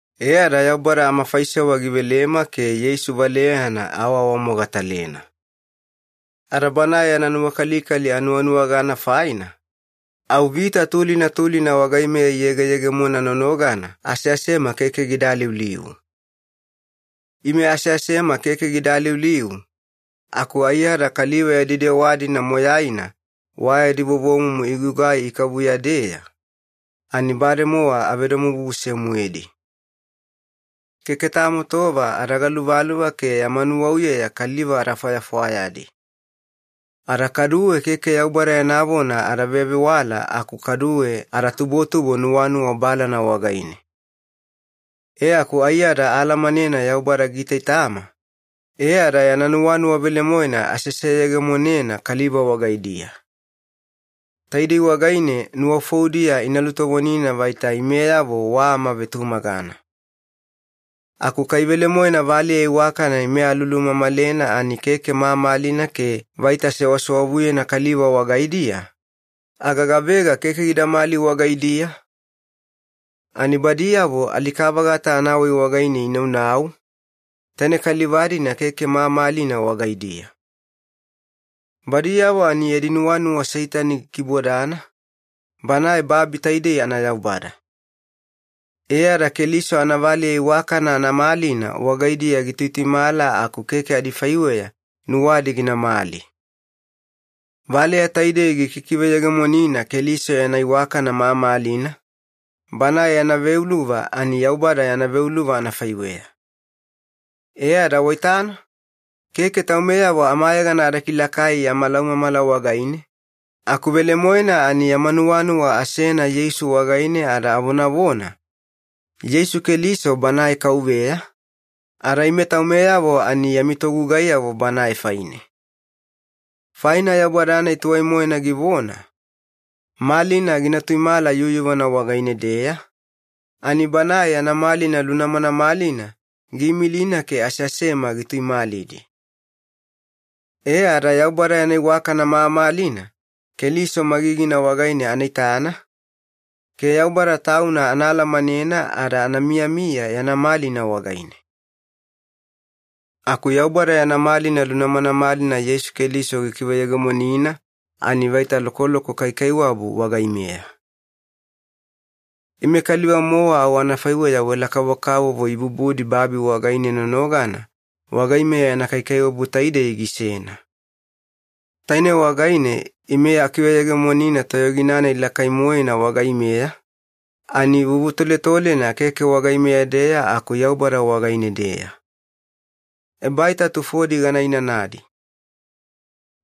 E ada Yaubada amafaisewa givelema ke Yeisu valeyana aawaawamogatalena. Ada Banae yana nuwakalikali anuwanuwagana faina, au vita tulina tulina wagaimeya iyegeyegemona nonogana aseasema keke gida aliuliu. Ime aseasema keke gida aliuliu, aku aiyada kaliva yadi dewa-dina moyaina wa yadi vovomumu igugai ikavuya-deya, ani bademowa avedomobubuse-moedi. Keke tamo tova ada galuvaluva ke yama nuwauyeya kaliva ada fwayafwayadi. Ada kaduwe keke Yaubada yana vona ada vevewala aku kaduwe ada tubotubo nuwanuwa balana wagaine. E aku aiyada aalamanena Yaubada giitaitama, e ada yana nuwanuwa velemoena aseseyegemonena kaliva wagaidiya. Taidei wagaine nuwafoudiya ina lutovonina vaita imeyavo wa amavetumagana. Aku kai velemoena valeya iwakana ime alulumamalena ani keke mamalina ke vaita sewasewavuyena kaliva wagaidiya, aga gavega keke gidamali wagaidiya? Ani badiyavo alika-vagata anawai wagaine inaunau, taine kaliva-dina keke mamalina wagaidiya. Badiyavo ani yadi nuwanuwa Seitani gikibodana, banae babi taidei anayaubada. E ada Keliso anavaleya iwakana anamalina wagaidiya gituituimala aku keke adifaiweya nuwadi ginamali. Valeya taidei gikikiveyegemonina Keliso yana iwakana mamalina, Banae yana veuluva ani Yaubada yana veuluva anafaiweya. E ada waitana, keke taumeyavo amayegana ada kilakai yama laumamala wagaine, aku velemoena ani yama nuwanuwa asena Yeisu wagaine ada avonavona, “Yeisu Keliso Banae Kauveya, ada ime taumeyavo ani yami togugaiyavo Banae faine.” Faina Yaubada-nai tuwai-moena givona, “Malina gina tuimala yuyuvana wagaine-deya,” ani Banae yana malina lunamanamalina giimilina ke aseasema gituimalidi. E ada Yaubada yana iwakana mamalina Keliso magigina wagaine ana itana, ke Yaubada Tauna ana alamanena ada ana miyamiya yana malina wagaine. Aku Yaubada yana malina lunamanamalina Yeisu Keliso gikiveyegemonina ani vaita lokoloko kaikaiwabu wagaimeya. Ime kaliva-mowa au anafaiweya wela kavokavovo ibubudi babi wagaine nonogana wagaimeya yana kaikaiwabu taidei gisena. Taine wagaine ime akiveyegemonina toyogina-nai lakai-moena wagaimeya, ani vuvutoletolena keke wagaimeya-deya aku Yaubada wagaine-deya. Ebaita tufodi gana inanadi.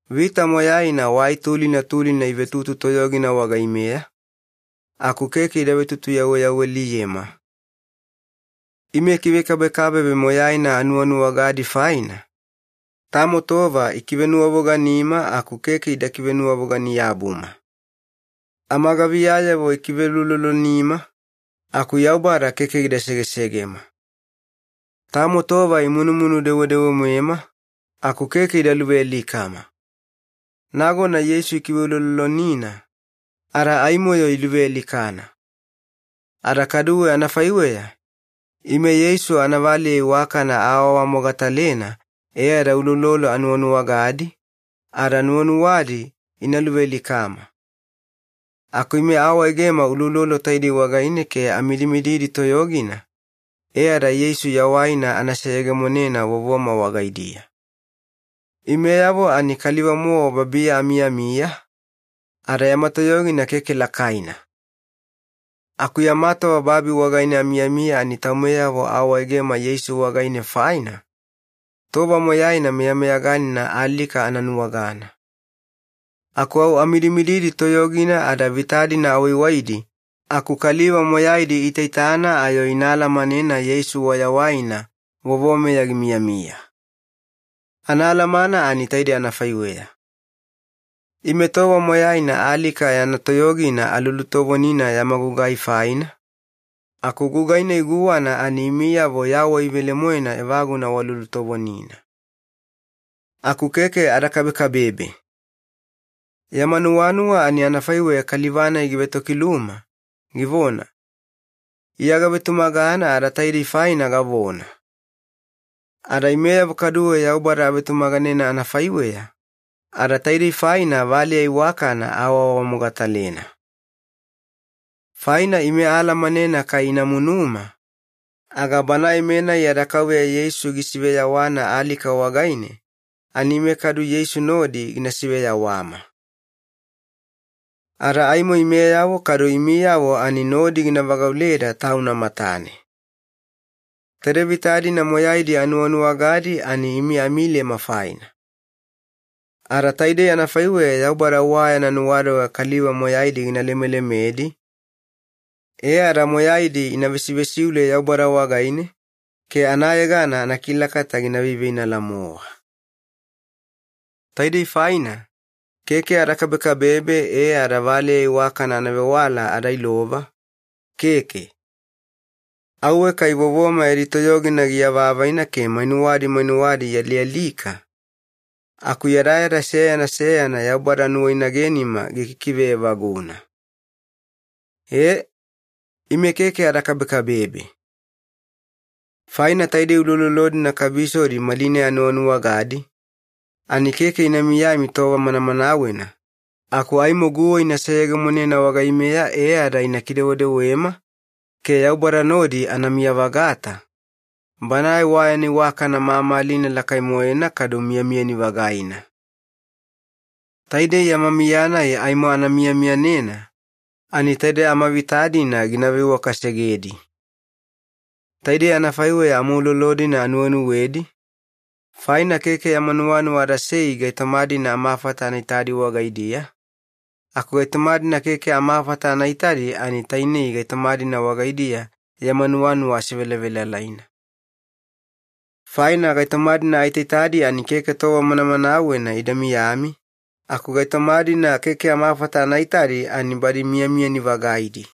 Vita moyaina wai tulina tulina ivetutu toyogina wagaimeya, aku keke ida vetutuyawaliyema. Ime kivekabekabebe moyaina anuwanuwagadi faina, tamo tova ikivenuwavoganima aku keke ida kivenuwavogani-yabuma. Amagaviyayavo ikiveuloulolonima, aku Yaubada keke gida segesegema. Tamo tova imunumunu dewedewe-moema, aku keke ida luvealikama. Nagona Yeisu ikiveuloulolonina, ada aimo-yo iluvealikana. Ada kaduwe anafaiweya, ime Yeisu anavaleya iwakana aawaawamogatalena e ada uloulolo anuwanuwagadi, ada nuwanuwadi ina luvealikama. Aku ime aawaegema uloulolo taidei wagaine ke amidimididi toyogina, e ada Yeisu yawaina ana seyegemonena vovoma wagaidiya. Imeyavo ani kaliva-mowa babiya amiyamiya, ada yama toyogina keke lakaina. Aku yama tova babi wagaine amiyamiya ani taumeyavo aawaegema Yeisu wagaine faina, tova moyaina meyameyaganina alika ana nuwagana. Aku au amidimididi toyogina ada vita-dina awaiwaidi aku kaliva moyaidi iitaitana ayo ina alamanena Yeisu wayawaina vovomeya gimiyamiya. Anaalamana ani taidei anafaiweya. Ime tova moyaina alika yana toyogina alulutovonina yama gugai faina, aku gugai-nai guwana ani imiyavo yawai velemoena evaguna walulutovonina. Aku keke ada kabekabebe. Yama nuwanuwa ani anafaiweya kaliva-nai givetokiluma, givona, “Iya gavetumagana ada taidei faina gavona.” Ada imeyavo kaduwe Yaubada avetumaganena anafaiweya, ada taidei faina valeya iwakana aawaawamogatalena. Faina ime aalamanena kai ina munuma, aga Banae-menai yada Kauveya Yeisu gisiveyawana alika wagaine ani ime kadu Yeisu nodi gina siveyawama. Ada aimo imeyavo kadu imiyavo ani nodi gina vagauleda Tauna matane. Taide vita-dina moyaidi anuwanuwagadi ani imi amilema faina. Ada taidei anafaiweya Yaubada wa yana nuwadoga kaliva moyaidi gina lemelemedi, e ada moyaidi ina vesivesiule Yaubada wagaine ke anayegana anakilakata gina veiveinala-mowa. Taidei faina, keke ada kabekabebe e ada valeya iwakana anavewala ada ilova, keke. Auwe kai vovoma yadi toyogina giavaavaina ke mainuwadi mainuwadi ialialika, aku yadayada seyana seyana Yaubada nuwainagenima gikikive evaguna. Ee, ime keke ada kabekabebe. Faina taidei uloulolo-dina kabisodi malinai anuwanuwagadi, ani keke ina miyami tova manamanawena, aku aimo guwa ina seyegemonena wagaimeya e ada ina kidewedewema ke Yaubada nodi anamiya-vagata, Banae wa yana iwakana mamalina lakai-moena kadu miyamiyani-vagaina. Taidei yama miya-nai aimo ana miyamiyanena, ani taide amavita-dina gina veiwakasegedi. Taidei anafaiweya amaulolo-dina anuwenuwedi, faina keke yama nuwanuwa adasei gaitoma-dina amafata ana itadi wagaidiya, aku gaitoma-dina keke amafata ana itadi ani tainei gaitoma-dina wagaidiya yama nuwanuwa asevelavelalaina. Faina gaitoma-dina aitaitadi ani keke tova manamanawena ida miyami, aku gaitoma-dina keke amafata anaita ani badi miyamiyani-vagaidi.